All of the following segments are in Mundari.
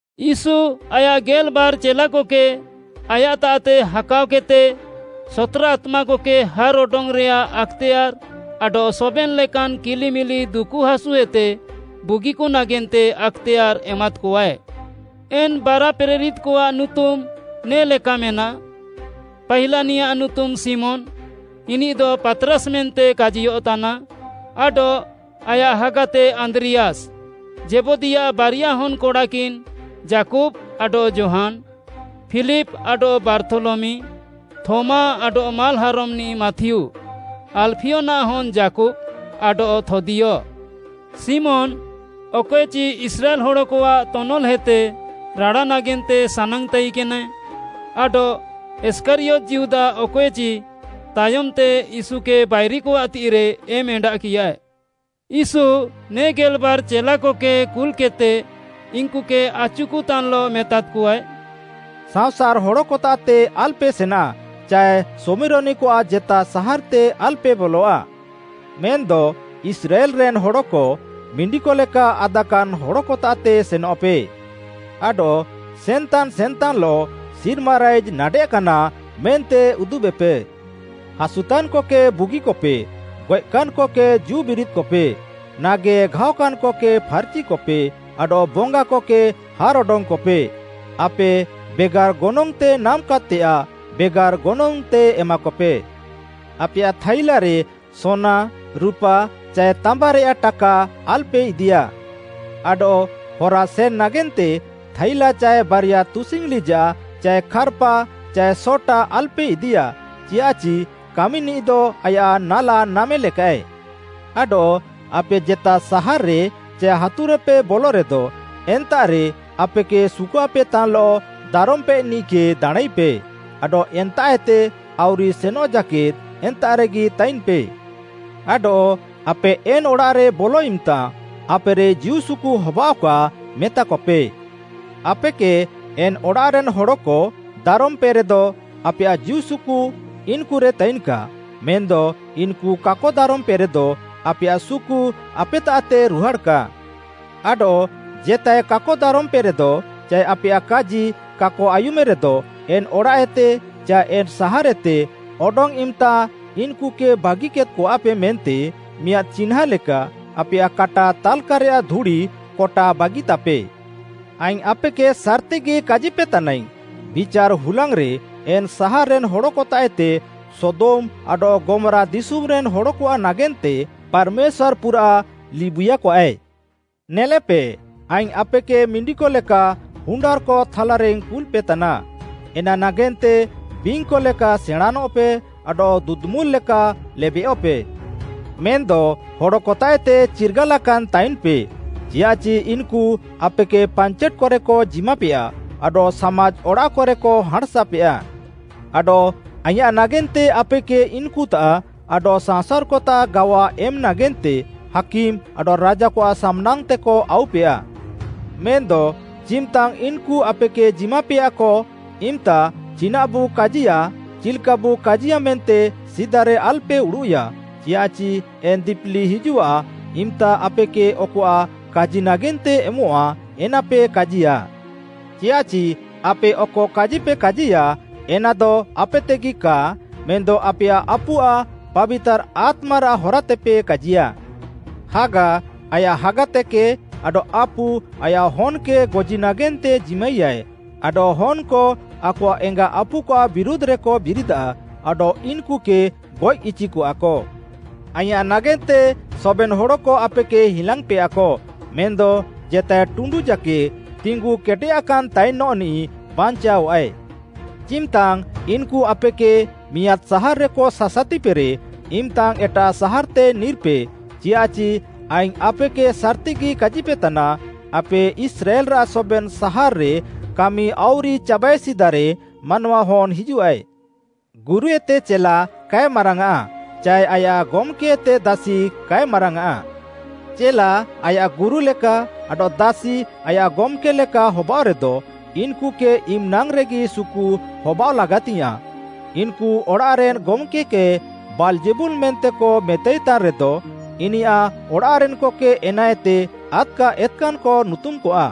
ୟୀଶୁ ଆୟାଃ ଗେଲ୍‌ବାର୍‌ ଚେଲାକକେ ଆୟାଃତାଃତେ ହାକାଅକେଦ୍‌ତେ ସତ୍‌ରା ଆତ୍ମାକକେ ହାର୍‌ଅଡଙ୍ଗ୍‌ରେୟାଃ ଆକ୍‌ତେୟାର୍‌ ଆଡଃ ସବେନ୍‌ ଲେକାନ୍‌ କିଲିମିଲି ଦୁକୁ ହାସୁଏତେ ବୁଗିକ ନାଗେନ୍ତେ ଆକ୍‌ତେୟାର୍‌ ଏମାଦ୍‌କଆଏ। ଏନ୍‌ ବାରା ପ୍ରେରିତ୍‌କଆଃ ନୁତୁମ୍‌ ନେ ଲେକା ମେନାଃ, ପାହିଲାନିୟାଃ ନୁତୁମ୍‌ ଶିମୋନ୍‌, ଇନିଃଦ ପାତ୍‌ରାସ୍‌ ମେନ୍ତେ କାଜିୟଃତାନା ଆଡଃ ଆୟାଃ ହାଗାତେ ଆନ୍ଦ୍ରିୟାସ୍‌, ଜେବଦୀୟାଃ ବାରିଆ ହନ୍‌କଡ଼ାକିନ୍‌ ଯାକୁବ୍‌ ଆଡଃ ଯୋହାନ୍‌, ଫିଲିପ୍‌ ଆଡଃ ବାର୍ଥୋଲମି, ଥୋମା ଆଡଃ ମାଲ୍‌ହାରମ୍‌ନିଃ ମାଥିଉ, ଆଲ୍‌ଫିୟନାଃ ହନ୍‌ ଯାକୁବ୍‌, ଆଡଃ ଥଦ୍ଦିୟ, ଶିମୋନ୍‌ ଅକଏଚି ଇସ୍ରାଏଲ୍‌ ହଡ଼କଆଃ ତନଲ୍‌ହେତେ ରାଡ଼ା ନାଗେନ୍ତେ ସାନାଙ୍ଗ୍‌ ତାଇକେନାଏ, ଆଡଃ ଇଷ୍କାରିୟତ୍‌ ଯିହୁଦା ଅକଏଚି ତାୟମ୍‌ତେ ୟୀଶୁକେ ବାଇରିକଆଃ ତିଃଇରେ ଏମ୍‌ ଏଣ୍ଡାଃକିୟାଏ। ୟୀଶୁ ନେ ଗେଲ୍‌ବାର୍‌ ଚେଲାକକେ କୁଲ୍‌କେଦ୍‌ତେ ଇନ୍‌କୁକେ ଆଚୁକତାନ୍‌ଲଃ ମେତାଦ୍‌କଆଏ, “ସାଅଁସାର୍‌ ହଡ଼କତାଃତେ ଆଲ୍‌ପେ ସେନା ଚାଏ ଶମିରୋନିକଆଃ ଜେତା ସାହାର୍‌ତେ ଆଲ୍‌ପେ ବଲଆ। ମେନ୍‌ଦ ଇସ୍ରାଏଲ୍‌ରେନ୍‌ ହଡ଼କ, ମିଣ୍ଡିକଲେକା ଆଦାକାନ୍‌ ହଡ଼କତାଃତେ ସେନଃପେ। ଆଡଃ ସେନ୍‌ତାନ୍‌ ସେନ୍‌ତାନ୍‌ଲଃ ‘ସିର୍ମା ରାଇଜ୍‌ ନାଡ଼େଃକାନା’ ମେନ୍ତେ ଉଦୁବେପେ। ହାସୁତାନ୍‌କକେ ବୁଗିକପେ, ଗଏଃକାନ୍‌କକେ ଜୀଉବିରିଦ୍‌କପେ, ନାଗେଘାଅକାନ୍‌କକେ ଫାର୍‌ଚିକପେ ଆଡଃ ବଙ୍ଗାକକେ ହାର୍‌ ଅଡଙ୍ଗ୍‌କପେ। ଆପେ ବେଗାର୍‌ ଗନଙ୍ଗ୍‌ତେ ନାମ୍‌କାଦ୍‌ତେୟାଃ ବେଗାର୍‌ ଗନଙ୍ଗ୍‌ତେ ଏମାକପେ। ଆପେୟାଃ ଥାଇଲାରେ ସୋନା, ରୁପା ଚାଏ ତାମ୍ବାରେୟାଃ ଟାକା ଆଲ୍‌ପେ ଇଦିୟା। ଆଡଃ ହରା ସେନ୍‌ ନାଗେନ୍ତେ ଥାଇଲା ଚାଏ ବାରିଆ ତୁସିଙ୍ଗ୍‌ ଲିଜାଃ ଚାଏ ଖାର୍‌ପା ଚାଏ ସଟା ଆଲ୍‌ପେ ଇଦିୟା, ଚିୟାଃଚି କାମିନିଃଦ ଆୟାଃ ନାଲା ନାମେ ଲେକାଃଏ। “ଆଡଃ ଆପେ ଜେତା ସାହାର୍‌ରେ ଚାଏ ହାତୁରେପେ ବଲରେଦ, ଏନ୍ତାଃରେ ଆପେକେ ସୁକୁଆପେତାନ୍‌ଲଃ ଦାରମ୍‌ପେନିଃକେ ଦାଣାଁଁଇପେ, ଆଡଃ ଏନ୍ତାଃଏତେ ଆଉରି ସେନଃ ଜାକେଦ୍‌ ଏନ୍ତାଃରେଗି ତାଇନ୍‌ପେ। ଆଡଃ ଆପେ ଏନ୍‌ ଅଡ଼ାଃରେ ବଲ ଇମ୍‌ତା, ‘ଆପେରେ ଜୀଉସୁକୁ ହବାଅଃକା’ ମେତାକପେ। ଆପେକେ ଏନ୍‌ ଅଡ଼ାଃରେନ୍‌ ହଡ଼କ ଦାରମ୍‌ପେରେଦ, ଆପେୟାଃ ଜୀଉସୁକୁ ଇନ୍‌କୁରେ ତାଇନ୍‌କା, ମେନ୍‌ଦ ଇନ୍‌କୁ କାକ ଦାରମ୍‌ପେରେଦ ଆପେୟାଃ ସୁକୁ ଆପେତାଃତେ ରୁହାଡ଼୍‌କା। ଆଡଃ ଜେତାଏ କାକ ଦାରମ୍‌ପେରେଦ ଚାଏ ଆପେୟାଃ କାଜି କାକ ଆୟୁମ୍‌ରେଦ, ଏନ୍‌ ଅଡ଼ାଃଏତେ ଚାଏ ଏନ୍‌ ସାହାର୍‌ଏତେ ଅଡଙ୍ଗ୍‌ ଇମ୍‌ତା ଇନ୍‌କୁକେ ବାଗିକେଦ୍‌କଆପେ ମେନ୍ତେ ମିଆଁଦ୍‌ ଚିହ୍ନାଁ ଲେକା ଆପେୟାଃ କାଟା ତାଲ୍‌କାରେୟାଃ ଧୁଡ଼ି କଟା ବାଗିତାପେ। ଆଇଙ୍ଗ୍‌ ଆପେକେ ସାର୍‌ତିଗି କାଜିପେତାନାଇଙ୍ଗ୍‌, ବିଚାର୍‌ ହୁଲାଙ୍ଗ୍‌ରେ ଏନ୍‌ ସାହାର୍‌ରେନ୍‌ ହଡ଼କତାଃଏତେ ସୋଦମ୍‌ ଆଡଃ ଗମ୍‌ରା ଦିଶୁମ୍‌ରେନ୍‌ ହଡ଼କଆଃ ନାଗେନ୍ତେ ପାର୍‌ମେଶ୍ୱାର୍‌ ପୁରାଃ ଲିବୁଇୟାକଆଏ। “ନେଲେପେ, ଆଇଙ୍ଗ୍‌ ଆପେକେ ମିଣ୍ଡିକ ଲେକା ହୁଣ୍ଡାର୍‌କ ଥାଲାରେଇଙ୍ଗ୍‌ କୁଲ୍‌ପେତାନା, ଏନା ନାଗେନ୍ତେ ବିଙ୍ଗ୍‌କ ଲେକା ସେଣାଁଁନଃପେ ଆଡଃ ଦୁଦୁମୁଲ୍‌କ ଲେକା ଲେବେୟଃପେ। ମେନ୍‌ଦ ହଡ଼କତାଃଏତେ ଚିର୍ଗାଲାକାନ୍‌ ତାଇନ୍‌ପେ, ଚିୟାଃଚି ଇନ୍‌କୁ ଆପେକେ ପାଞ୍ଚେଟ୍‌କରେକ ଜିମାପେୟା ଆଡଃ ସାମାଜ୍‌ ଅଡ଼ାଃକରେକ ହାଁଣ୍‌ସାପେୟା। ଆଡଃ ଆଇଁୟାଃ ନାଗେନ୍ତେ ଆପେକେ ଇନ୍‌କୁତାଃ ଆଡଃ ସାଅଁସାର୍‌କତାଃ ଗାୱା ଏମ୍‌ ନାଗେନ୍ତେ ହାକିମ୍‌ ଆଡଃ ରାଜାକଆଃ ସାମ୍‌ନାଙ୍ଗ୍‌ତେକ ଆଉପେୟା। ହାକିମ୍‌ ଆଡଃ ରାଜାକଆଃ ସାମ୍‌ନାଙ୍ଗ୍‌ତେକ ଆଉପେୟା। ମେନ୍‌ଦ ଚିମ୍‌ତାଙ୍ଗ୍‌ ଇନ୍‌କୁ ଆପେକେ ଜିମାପେୟାକ ଇମ୍‌ତା ଚିନାଃବୁ କାଜିୟା ଚିଲ୍‌କାବୁ କାଜିୟା ମେନ୍ତେ ସିଦାରେ ଆଲ୍‌ପେ ଉଡ଼ୁଃୟା, ଚିୟାଃଚି ଏନ୍‌ ଦିପିଲି ହିଜୁଃଆ ଇମ୍‌ତା ଆପେକେ ଅକଆଃ କାଜି ନାଗେନ୍ତେ ଏମଃଆ ଏନାପେ କାଜିୟା। ଚିୟାଃଚି ଆପେ ଅକ କାଜିପେ କାଜିୟା ଏନାଦ ଆପେତେଗି କା, ମେନ୍‌ଦ ଆପେୟାଃ ଆପୁଆଃ ପାବିତାର୍‌ ଆତ୍ମାରାଃ ହରାତେପେ କାଜିୟା। “ହାଗା ଆୟାଃ ହାଗାତେକେ ଆଡଃ ଆପୁ ଆୟାଃ ହନ୍‌କେ ଗଜି ନାଗେନ୍ତେ ଜିମାଇୟାଏ, ଆଡଃ ହନ୍‌କ ଆକଆଃ ଏଙ୍ଗା ଆପୁକଆଃ ବିରୁଧ୍‌ରେକ ବିରିଦାଃ ଆଡଃ ଇନ୍‌କୁକେ ଗଏଃ ଇଚିକଆକ। ଆଇଁୟାଃ ନାଗେନ୍ତେ ସବେନ୍‌ ହଡ଼କ ଆପେକେ ହିଲାଙ୍ଗ୍‌ପେୟାକ, ମେନ୍‌ଦ ଜେତାଏ ଟୁଣ୍ଡୁ ଜାକେଦ୍‌ ତିଙ୍ଗୁ କେଟେୟାକାନ୍ ତାଇନ୍‌ନିଃ ବାଞ୍ଚାଅଃଆଏ। ଚିମ୍‌ତାଙ୍ଗ୍‌ ଇନ୍‌କୁ ଆପେକେ ମିଆଁଦ୍‌ ସାହାର୍‌ରେକ ସାସାତିପେରେ, ଇମ୍‌ତାଙ୍ଗ୍‌ ଏଟାଃ ସାହାର୍‌ତେ ନିର୍‌ପେ, ଚିୟାଃଚି ଆଇଙ୍ଗ୍‌ ଆପେକେ ସାର୍‌ତିଗି କାଜିପେତାନା, ଆପେ ଇସ୍ରାଏଲ୍‌ରାଃ ସବେନ୍‌ ସାହାର୍‌ରେ କାମି ଆଉରି ଚାବାଏ ସିଦାରେ ମାନୱାହନ୍‌ ହିଜୁଃଆଏ। “ଗୁରୁଏତେ ଚେଲା କାଏ ମାରାଙ୍ଗ୍‌ଆଃ ଚାଏ ଆୟାଃ ଗମ୍‌କେଏତେ ଦାସି କାଏ ମାରାଙ୍ଗ୍‌ଆଁ। ଚେଲା ଆୟାଃ ଗୁରୁ ଲେକା ଆଡଃ ଦାସି ଆୟାଃ ଗମ୍‌କେ ଲେକା ହବାଅଃରେଦ, ଇନ୍‌କୁକେ ଇମ୍‌ନାଙ୍ଗ୍‌ରେଗି ସୁକୁ ହବାଅଃ ଲାଗାତିଙ୍ଗ୍‌ୟାଁଃ। ଇନ୍‌କୁ ଅଡ଼ାଃରେନ୍‌ ଗମ୍‌କେ କେ ବାଲ୍‌ଜେବୁଲ୍‌ ମେନ୍ତେକ ମେତାଇତାନ୍‌ରେଦ, ଇନିୟାଃ ଅଡ଼ାଃରେନ୍‌କକେ ଏନାଏତେ ଆଦ୍‌କା ଏତ୍‌କାନ୍‌କ ନୁତୁମ୍‌କଆ।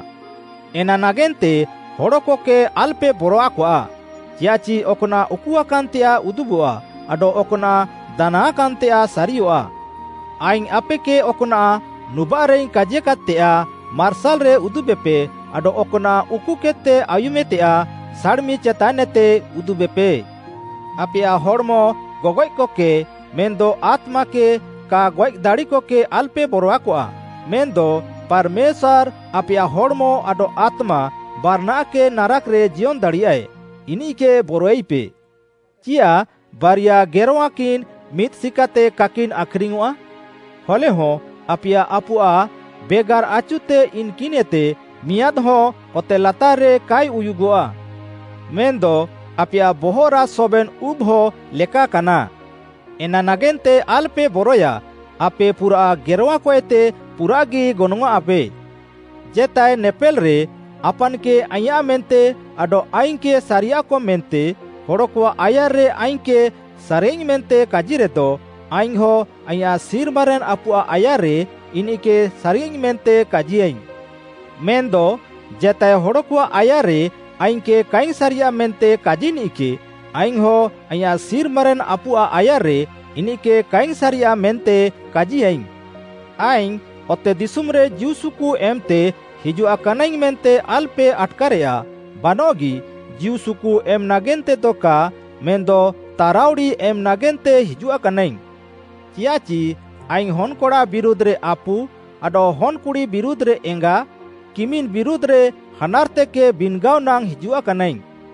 “ଏନା ନାଗେନ୍ତେ ହଡ଼କକେ ଆଲ୍‌ପେ ବରଆକଆ, ଚିୟାଃଚି ଅକ୍‌ନାଃ ଉକୁଆକାନ୍‌ତେୟାଃ ଉଦୁବଃଆ ଆଡଃ ଅକ୍‌ନାଃ ଦାନାଙ୍ଗ୍‌ଆଁକାନ୍‌ତେୟାଃ ସାରିୟଃଆ। ଆଇଙ୍ଗ୍‌ ଆପେକେ ଅକ୍‌ନାଃ ନୁବାଃରେଇଙ୍ଗ୍‌ କାଜିକାଦ୍‌ତେୟାଃ ମାର୍ସାଲ୍‌ରେ ଉଦୁବେପେ ଆଡଃ ଅକ୍‌ନାଃ ଉକୁକେଦ୍‌ତେ ଆୟୁମେତେୟାଃ ସାଡ଼୍‌ମି ଚେତାନ୍ଏତେ ଉଦୁବେପେ। ଆପେୟାଃ ହଡ଼୍‌ମ ଗଗଏଃକକେ, ମେନ୍‌ଦ ଆତ୍ମାକେ କା ଗଏଃ ଦାଡ଼ିକକେ ଆଲ୍‌ପେ ବରଆକଆ, ମେନ୍‌ଦ ପାର୍‌ମେଶ୍ୱାର୍‌ ଆପେୟାଃ ହଡ଼୍‌ମ ଆଡଃ ଆତ୍ମା ବାରାନାଃକେ ନାରାକ୍‌ରେ ଜିୟନ୍‌ ଦାଡ଼ିୟାଏ, ଇନିଃକେ ବରଆଇପେ। ଚିୟାଃ ବାରିଆ ଗେରଁୱାକିନ୍‌ ମିଦ୍‌ ସିକାତେ କାକିନ୍‌ ଆଖ୍‌ରିଙ୍ଗ୍‌ୟଃଆ? ହଲେହଁ ଆପେୟାଃ ଆପୁଆଃ ବେଗାର୍‌ ଆଚୁତେ ଇନ୍‌କିନ୍‌ଏତେ ମିଆଁଦ୍‌ହଁ ଅତେ ଲାତାର୍‌ରେ କାଏ ଉୟୁଗଃଆ। ମେନ୍‌ଦ ଆପେୟାଃ ବହଃରାଃ ସବେନ୍‌ ଉବ୍‌ହ ଲେକାକାନା। ଏନା ନାଗେନ୍ତେ ଆଲ୍‌ପେ ବରଏୟା, ଆପେ ପୁରାଃ ଗେରଁୱାକଏତେ ପୁରାଃଗି ଗନଙ୍ଗ୍‌ଆଃଁପେ। “ଜେତାଏ ନେପେଲ୍‌ରେ ଆପାନ୍‌କେ ଆଇଁୟାଃ ମେନ୍ତେ ଆଡଃ ଆଇଙ୍ଗ୍‌କେ ସାରିୟାଃକ ମେନ୍ତେ ହଡ଼କଆଃ ଆୟାର୍‌ରେ ଆଇଙ୍ଗ୍‌କେ ସାରିୟାଃଇଙ୍ଗ୍‌ ମେନ୍ତେ କାଜିରେଦ, ଆଇଙ୍ଗ୍‌ହଁ ଆଇଁୟାଃ ସିର୍ମାରେନ୍‌ ଆପୁଆଃ ଆୟାର୍‌ରେ ଇନିଃକେ ସାରିୟାଃଇଙ୍ଗ୍‌ ମେନ୍ତେ କାଜିୟାଇଙ୍ଗ୍‌। ମେନ୍‌ଦ ଜେତାଏ ହଡ଼କଆଃ ଆୟାର୍‌ରେ ଆଇଙ୍ଗ୍‌କେ କାଇଙ୍ଗ୍‌ ସାରିୟାଃ ମେନ୍ତେ କାଜିନିଃକେ, ଆଇଙ୍ଗ୍‌ହଁ ଆଇଁୟାଃ ସିର୍ମାରେନ୍‌ ଆପୁଆଃ ଆୟାର୍‌ରେ ଇନିଃକେ କାଇଙ୍ଗ୍‌ ସାରିୟାଃ ମେନ୍ତେ କାଜିୟାଇଙ୍ଗ୍‌। “ଆଇଙ୍ଗ୍‌ ଅତେଦିଶୁମ୍‌ରେ ଜୀଉସୁକୁ ଏମ୍‌ତେ ହିଜୁଆକାନାଇଙ୍ଗ୍‌ ମେନ୍ତେ ଆଲ୍‌ପେ ଆଟ୍‌କାରେୟା। ବାନଃଗି, ଜୀଉସୁକୁ ଏମ୍‌ ନାଗେନ୍ତେଦ କା ମେନ୍‌ଦ ତାରାଉଡ଼ି ଏମ୍‌ ନାଗେନ୍ତେ ହିଜୁଆକାନାଇଙ୍ଗ୍‌। ଚିୟାଃଚି ଆଇଙ୍ଗ୍‌ ହନ୍‌କଡ଼ା ବିରୁଧ୍‌ରେ ଆପୁ, ଆଡଃ ହନ୍‌କୁଡ଼ି ବିରୁଧ୍‌ରେ ଏଙ୍ଗା, କିମିନ୍‌ ବିରୁଧ୍‌ରେ ହାନାର୍‌ତେକେ ବିନ୍‌ଗାଅ ନାଙ୍ଗ୍‌ ହିଜୁଆକାନାଇଙ୍ଗ୍‌।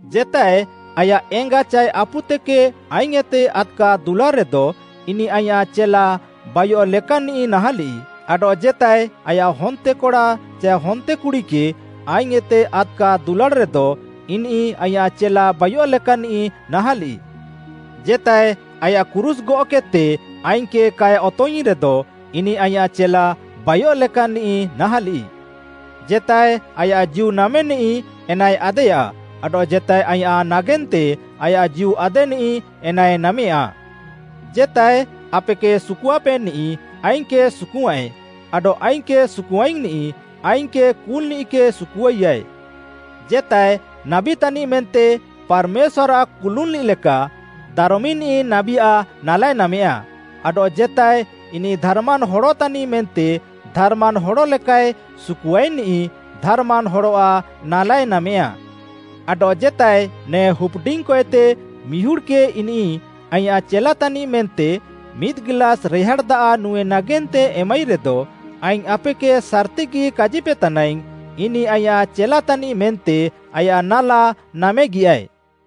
“ଜେତାଏ ଆୟାଃ ଏଙ୍ଗା ଚାଏ ଆପୁତେକେ ଆଇଙ୍ଗ୍‌ଏତେ ଆଦ୍‌କା ଦୁଲାଡ଼୍‌ରେଦ, ଇନିଃ ଆଇଁୟାଃ ଚେଲା ବାଇୟଃ ଲେକାନ୍‌ନିଃ ନାହାଁଲିଃ, ଆଡଃ ଜେତାଏ ଲେକା ଆୟାଃ ହନ୍ତେକଡ଼ା ଚାଏ ହନ୍ତେକୁଡ଼ିକେ ଆଇଙ୍ଗ୍‌ଏତେ ଆଦ୍‌କା ଦୁଲାଡ଼୍‌ରେଦ, ଇନିଃ ଆଇଁୟାଃ ଚେଲା ବାଇୟଃ ଲେକାନ୍‌ନିଃ ନାହାଁଲିଃ। ଜେତାଏ ଆୟାଃ କ୍ରୁଶ୍‌ ଗଅଃକେଦ୍‌ତେ ଆଇଙ୍ଗ୍‌କେ କାଏ ଅତଙ୍ଗ୍‌ଇଙ୍ଗ୍‌ରେଦ, ଇନିଃ ଆଇଁୟାଃ ଚେଲା ବାଇୟଃ ଲେକାନ୍‌ନିଃ ନାହାଁଲିଃ। ଜେତାଏ ଆୟାଃ ଜୀଉ ନାମେନିଃ, ଏନାଏ ଆଦେୟା ଆଡଃ ଜେତାଏ ଆଇଁୟାଃ ନାଗେନ୍ତେ ଆୟାଃ ଜୀଉ ଆଦେନିଃ, ଏନାଏ ନାମେୟା। “ଜେତାଏ ଆପେକେ ସୁକୁଆପେନିଃ, ଆଇଙ୍ଗ୍‌କେ ସୁକୁଆୟାଁଏ, ଆଡଃ ଆଇଙ୍ଗ୍‌କେ ସୁକୁଆଇଙ୍ଗ୍‌ନିଃ, ଆଇଙ୍ଗ୍‌କେ କୁଲ୍‌ନିଃକେ ସୁକୁଆଇୟାଏ। ଜେତାଏ, ନାବୀ ତାନିଃ ମେନ୍ତେ ପାର୍‌ମେଶ୍ୱାର୍‌ଆଃ କୁନୁଲ୍‌ନିଃ ଲେକା ଦାରମିନିଃ ନାବୀଆଃ ନାଲାଏ ନାମେୟା ଆଡଃ ଜେତାଏ, ଇନିଃ ଧାର୍‌ମାନ୍‌ ହଡ଼ ତାନିଃ ମେନ୍ତେ ଧାର୍‌ମାନ୍‌ ହଡ଼ ଲେକାଏ ସୁକୁଆଇନିଃ ଧାର୍‌ମାନ୍‌ ହଡ଼ଆଃ ନାଲାଏ ନାମେୟା। ଆଡଃ ଜେତାଏ, ନେ ହୁପ୍‌ଡିଙ୍ଗ୍‌କଏତେ ମିହୁଡ଼୍‌କେ ଇନିଃ ଆଇଁୟାଃ ଚେଲା ତାନିଃ ମେନ୍ତେ ମିଦ୍‌ ଗିଲାସ୍‌ ରେହାଡ଼୍‌ ଦାଆଃ ନୁଁଏ ନାଗେନ୍ତେ ଏମାଇରେଦ, ଆଇଙ୍ଗ୍‌ ଆପେକେ ସାର୍‌ତିଗି କାଜିପେତାନାଇଙ୍ଗ୍‌, ଇନିଃ ଆଇଁୟାଃ ଚେଲାତାନିଃ ମେନ୍ତେ ଆୟାଃ ନାଲା ନାମେଗିୟାଏ।”